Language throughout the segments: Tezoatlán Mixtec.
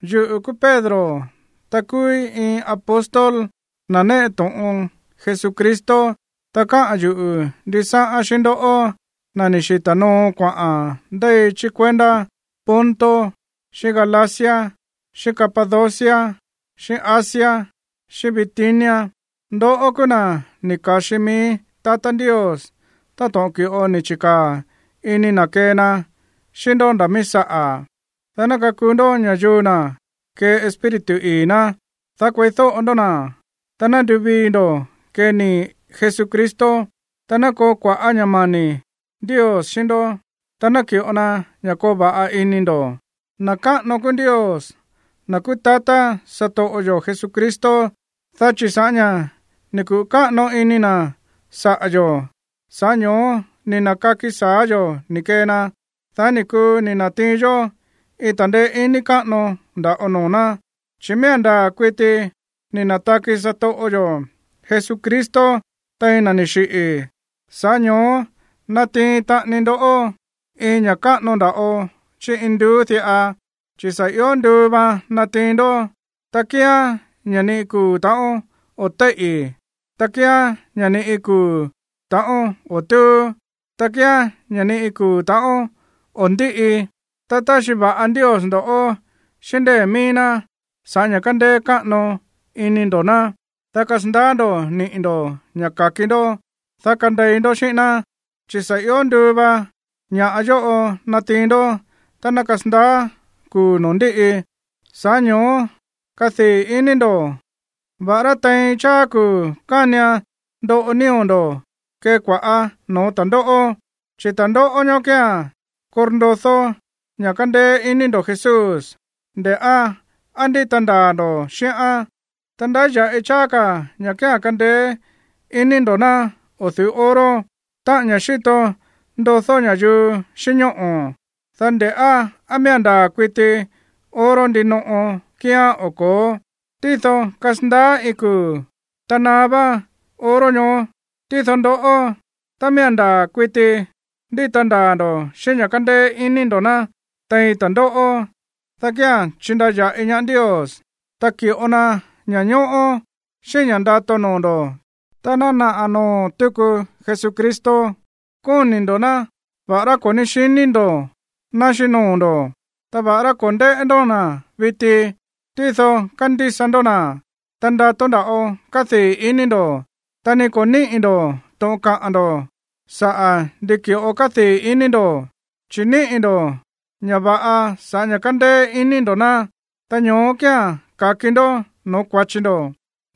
Yuꞌu̱ kúú Pedro, ta kúúí iin apóstol, na̱ néꞌe to̱ꞌon Jesucristo. Ta káꞌa̱n yuꞌu̱ ndisáꞌán xíꞌín ndoꞌó, na̱ ni̱ xita̱ noo kuaꞌa̱n ndéi chí kuendá Ponto, xíꞌín Galacia, xíꞌín Capadocia, xíꞌín Asia, xíꞌín Bitinia. Ndoꞌó kúú na̱ ni̱ ka̱xi mií tatá Ndios táto̱ꞌon ki̱ꞌo ni̱ chi̱kaa̱ ini na̱ kee na xíꞌín ndó nda̱ míí saꞌa̱, dá ná kakuu ndó ña̱yuu na̱ kee Espíritu ii̱ ná, dá kueídóꞌo ndó na̱, ta ná nduvii ndo̱ kee nii̱ Jesucristo. Ta ná koo kua̱ꞌá ña̱ mani̱ Ndios xíꞌín ndó, ta ná ki̱ꞌo na ña̱ koo va̱ꞌa ini ndo̱. Na̱ káꞌano kúú Ndios, na̱ kúú tatá satoꞌo yo̱ Jesucristo, dá chi̱ sa̱ꞌá ña̱ ni̱ kuꞌu̱ káꞌano ini na̱ saꞌa̱ yo̱, sa̱ꞌá ño̱ó ni̱ na̱kaki sa̱á yo̱ ni̱ kee na, dá ni̱ kuu ni̱ na̱tiin yó iin ta̱ndeé iní káꞌano nda̱ꞌo noo̱ ná, chi̱ miía̱n ndaa̱ kuiti ni̱ na̱taki satoꞌo yo̱ Jesucristo tein na̱ ni̱ xiꞌi̱. Sa̱ꞌá ño̱ó natiin taꞌani ndó iin ña̱ káꞌano nda̱ꞌo chí induú diꞌa, chi̱ sa̱ ió nduu vaan natiin ndoꞌó. Ta kíán ña̱ ni iin kuu̱ ta̱ꞌón o̱ téíꞌi̱, ta kíán ña̱ ni iin kuu̱ ta̱ꞌón o̱ túú, ta kíán ña̱ ni iin kuu̱ ta̱ꞌón o̱ ndíꞌi. Ta táxi va̱ꞌa Ndios ndo̱ꞌó xíꞌín ndée̱ míí ná sa̱ꞌá ña̱ kándéé káꞌano iní ndo̱ ná, dá kasandaá ndo̱ niꞌi̱ ndo̱ ña̱ ka̱ki ndó, dá kandei ndó xíꞌín ná, chi̱ sa̱ ió nduu va ña̱ꞌa yóꞌo natiin ndó tá ná kasandaá kuu̱ noo̱ ndíꞌi. Sa̱ꞌá ño̱ó kadii̱ iní ndo̱, va̱ꞌará tein cháá kuu̱ kánian ndoꞌo nío̱ ndo̱ kée kua̱ꞌá noo̱ ta̱ndóꞌó. Chi̱ ta̱ndóꞌó ñoó kía̱n korndodó ña̱ kándéé iní ndo̱ Jesús, nde̱ꞌá á ndíta ndaa̱ ndo̱ xíꞌán. Ta ndáya̱ꞌi cháá ka̱ ña̱ kía̱n kándéé iní ndo̱ ná o̱ du̱ú oro, táꞌa̱n ña̱ xíto ndodó ña̱yuu xíꞌín ñóꞌo̱, dá nde̱ꞌá á miía̱n ndaa̱ kuiti oro ndinoꞌo kíán o ko̱ó. Tído kasandaá iin kuu̱, ta naá vá oro ñoó. Tído ndoꞌó, tá miía̱n ndaa̱ kuiti ndíta ndaa̱ ndo̱ xíꞌín ña̱ kándéé iní ndo̱ ná tein ta̱ndóꞌó, dá kía̱n chindaya̱ꞌi ñaá Ndios, ta ki̱ꞌo na ña̱ñóꞌó, xíꞌín ña̱ ndato noo̱ ndo̱ tá ná naꞌa̱ noo̱ tuku Jesucristo. Kóni̱ ndo̱ ná, va̱ꞌará ko̱ ní xiní ndo̱ ná xíꞌín noo̱ ndo̱. Ta va̱ꞌará ko̱ ndéꞌé ndó na̱ viti, tído kándísa ndó na̱. Ta ndato nda̱ꞌo kádii̱ iní ndo̱, ta ni ko̱ níꞌi̱ ndo̱ to̱ꞌon kaꞌa̱n ndo̱ saꞌa̱ ndi ki̱ꞌo kádii̱ ini ndo̱, chi̱ níꞌi̱ ndo̱ ña̱ va̱ꞌa sa̱ꞌá ña̱ kándéé iní ndo̱ ná, ta ñoó kía̱n ka̱ki ndó no̱ó kua̱chi ndo̱.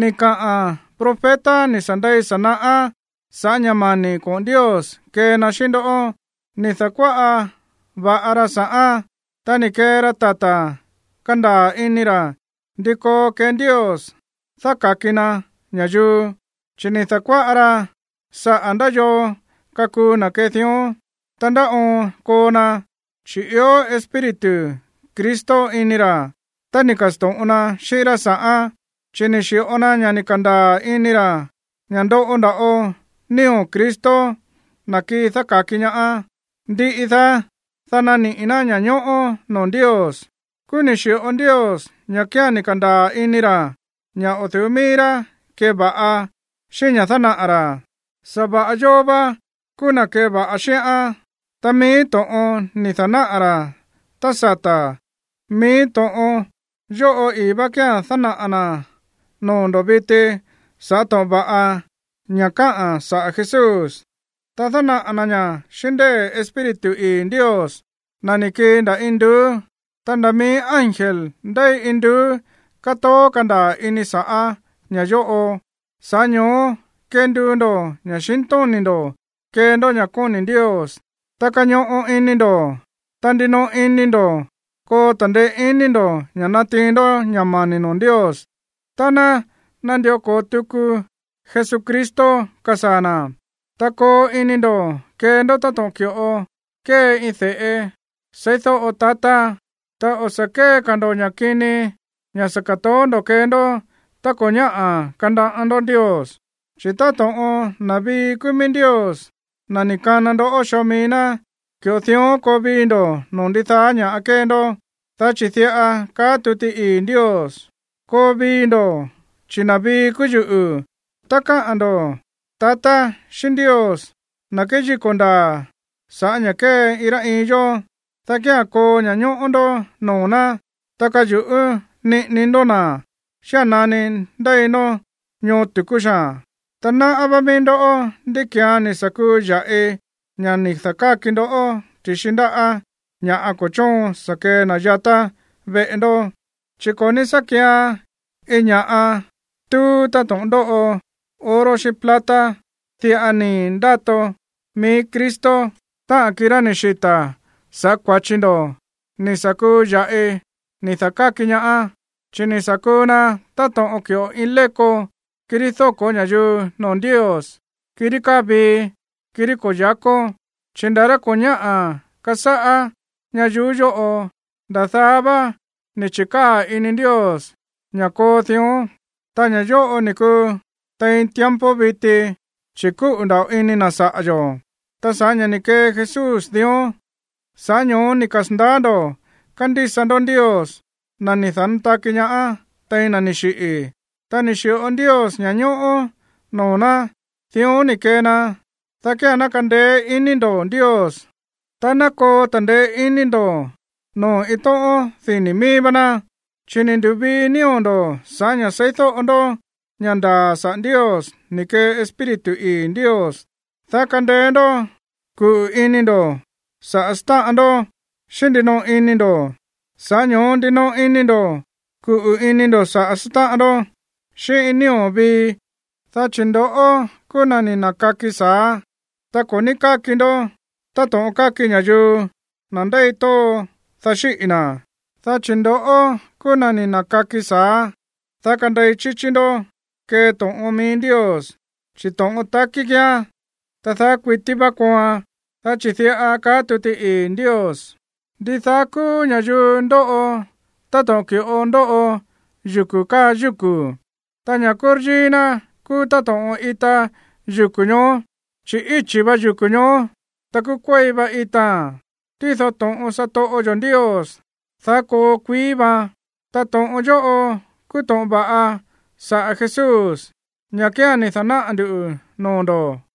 Ni̱ kaꞌa̱n profeta ni̱ sa̱ ndei sa̱ naꞌá sa̱ꞌá ña̱ mani̱ koꞌo̱n Ndios kee na xíꞌín ndó. Ni̱ da̱kuáꞌa va̱ꞌa ra sa̱ꞌán, ta ni̱ kee ra tata̱ kandaa̱ ini ra̱ ndi koo kee Ndios dáka̱ki na ña̱yuu. Chi̱ ni̱ da̱kuáꞌa ra saꞌa̱ ndá yoo kakuu na̱ kee dión, ta ndá oon koo na, chi̱ ió Espíritu Cristo ini ra̱, ta ni̱ ka̱sto̱ꞌon na xíꞌín rá sa̱ꞌán. Chi̱ ni̱ xi̱ꞌo na ña̱ ni̱ ka̱ndaa̱ ini ra̱ ña̱ ndoꞌo nda̱ꞌo nío̱ Cristo, na̱ kii dáka̱ki ñaá, ndiꞌi daá, dá naniꞌi̱ ná ña̱ñóꞌó noo̱ Ndios. Kúú ni̱ xi̱ꞌo Ndios ña̱ kía̱n ni̱ ka̱ndaa̱ ini ra̱ ña̱ o̱ du̱ú mií rá keva̱ꞌa xíꞌín ña̱ dánaꞌa̱ ra̱, sa̱va̱ꞌa yóó vá kúú na̱ keva̱ꞌa xíꞌán. Ta mií to̱ꞌon ni̱ da̱náꞌa̱ ra̱ tá sata̱, mií to̱ꞌon yóꞌo ii̱ vá kía̱n dánaꞌa̱ na̱ noo̱ ndo̱ viti sa̱ꞌá to̱ꞌon va̱ꞌa ña̱ káꞌa̱n saꞌa̱ Jesús, ta dánaꞌa̱ na̱ ñá xíꞌín ndée̱ Espíritu ii̱ Ndios, na̱ ni̱ kii nda̱ induú. Ta nda̱ mií ángel ndéi induú kátoó kandaa̱ ini sa̱ꞌá ña̱ yóꞌo. Sa̱ꞌá ño̱ó kenduu ndo̱ ña̱xintóni̱ ndo̱ kee ndó ña̱ kóni̱ Ndios, ta kañoꞌo ini ndo̱, ta ndinoꞌo ini ndo̱ koo ta̱ndeé iní ndo̱ ña̱ natiin ndó ña̱ mani̱ noo̱ Ndios tá ná nandió ko̱o tuku Jesucristo kasaa̱ na̱. Ta koo ini ndo̱ kee ndó táto̱ꞌon ki̱ꞌo kée iin de̱ꞌe seídóꞌo tatá, ta o̱ sa̱ kée ka̱ ndo̱ ña̱ kini, ña̱ sa̱ ka̱toó ndo̱ kee ndó tá ko̱ ñáꞌa̱ kanaꞌá ndó Ndios. Chi̱ táto̱ꞌon na̱ vii kúú míí Ndios, na̱ ni̱ kana ndoꞌó xoo mií ná, ki̱ꞌo dión koo vii ndo̱ no̱ó ndidaá ña̱ kée ndó. Dá chi̱ diꞌa kaá tuti ii̱ Ndios: “Koo vii ndo̱, chi̱ na̱ vii kúú yuꞌu̱.” Tá káꞌa̱n ndo̱ tatá xíꞌín Ndios, na̱ kéyíko̱ ndaa̱ sa̱ꞌá ña̱ kée iin rá iin yó, dá kía̱n koo ña̱ñóꞌó ndó noo̱ ná, ta kayu̱ꞌú niꞌini ndó na̱ xía̱n nani ndéi ndó ñoo tu̱kú xaa̱n. Ta náꞌá vá mií ndó ndí ki̱án ni̱ sa̱ kuu ya̱ꞌi, ña̱ ni̱ da̱káki ndoꞌó ti̱xi ndáꞌa̱ ña̱ ko̱ chóon sa̱ kee na̱ yatá veꞌe ndó. Chi̱ ko̱ ní sá kian iin ña̱ꞌa túú, táto̱ꞌon ndóꞌo oro xíꞌín plata. Diꞌa nii̱ ndato mií Cristo, táꞌa̱n kirá ni̱ xita̱ sa̱ꞌá kua̱chi ndo̱, ni̱ sa̱ kuu ya̱ꞌi ni̱ da̱káki ñaá. Chi̱ ni̱ sa̱ kuu na táto̱ꞌon ki̱ꞌo iin léko, kirí dóko̱ ña̱yuu noo̱ Ndios, kirí káa vii, kirí ko̱ yáko̱. Chi̱ nda̱ rá ko̱ ñáꞌa̱ kasáꞌá ñayuú yóꞌo, nda̱ daá vá ni̱ chi̱kaa̱ ini Ndios ña̱ koo dión. Ta ña̱ yóꞌo ni̱ kuu tein tiempo viti, chi̱ kúꞌu̱ nda̱ꞌo ini na̱ saꞌa̱ yo̱. Ta sa̱ꞌá ña̱ ni̱ kee Jesús dión, sa̱ꞌá ño̱ó ni̱ kasa̱ndaá ndo̱ kándísa ndó Ndios, na̱ ni̱ da̱nátaki ñaá tein na̱ ni̱ xiꞌi̱. Ta ni̱ xi̱ꞌo Ndios ña̱ñóꞌó noo̱ ná. Dión ni̱ kee na, dá kía̱n ná kandeé iní ndo̱ Ndios, ta ná koo ta̱ndeé iní ndo̱ noo̱ iin tóꞌón dini̱ míí vá ná. Chi̱ ni̱ ndu̱vii nío̱ ndo̱ sa̱ꞌá ña̱ seídóꞌo ndó ña̱ ndaa̱ saꞌa̱ Ndios ni̱ kee Espíritu ii̱ Ndios, dá kandeé ndó kuꞌu̱ ini ndo̱ saꞌa̱ sátáꞌan ndó xíꞌín ndinoꞌo ini ndo̱. Sa̱ꞌá ño̱ó ndinoꞌo ini ndo̱ kuꞌu̱ ini ndo̱ saꞌa̱ sátáꞌan ndó xíꞌín iin nío̱ vii. Dá chi̱ ndoꞌó kúú na̱ ni̱ na̱kaki sa̱á, ta ko̱ ní káki ndó táto̱ꞌon káki ña̱yuu, na̱ ndéi tóo, dá xíꞌi̱ na̱. Dá chi̱ ndo̱ꞌó kúú na̱ ni̱ na̱kaki sa̱á, dá kandei chíchí ndó kee to̱ꞌon mií Ndios, chi̱ to̱ꞌon takí kíán, ta daá kuití vá kooan. Dá chi̱ diꞌa kaá tuti ii̱ Ndios: Ndidaá kúú ña̱yuu ndóꞌo táto̱ꞌon ki̱ꞌo ndóꞌo yuku̱ káa yúku̱, ta ña̱ kúryíí ná kúú táto̱ꞌon ita yuku̱ ñoó. Chi̱ íchi̱ va yuku̱ ñoó, ta kúú kuéi va itaa̱n. Tído to̱ꞌon satoꞌo yo̱ Ndios, daá koo kuií vaan. Ta to̱ꞌon yóꞌo kúú to̱ꞌon va̱ꞌa saꞌa̱ Jesús, ña̱ kía̱n ni̱ da̱náꞌa̱ ndu̱ noo̱ ndo̱.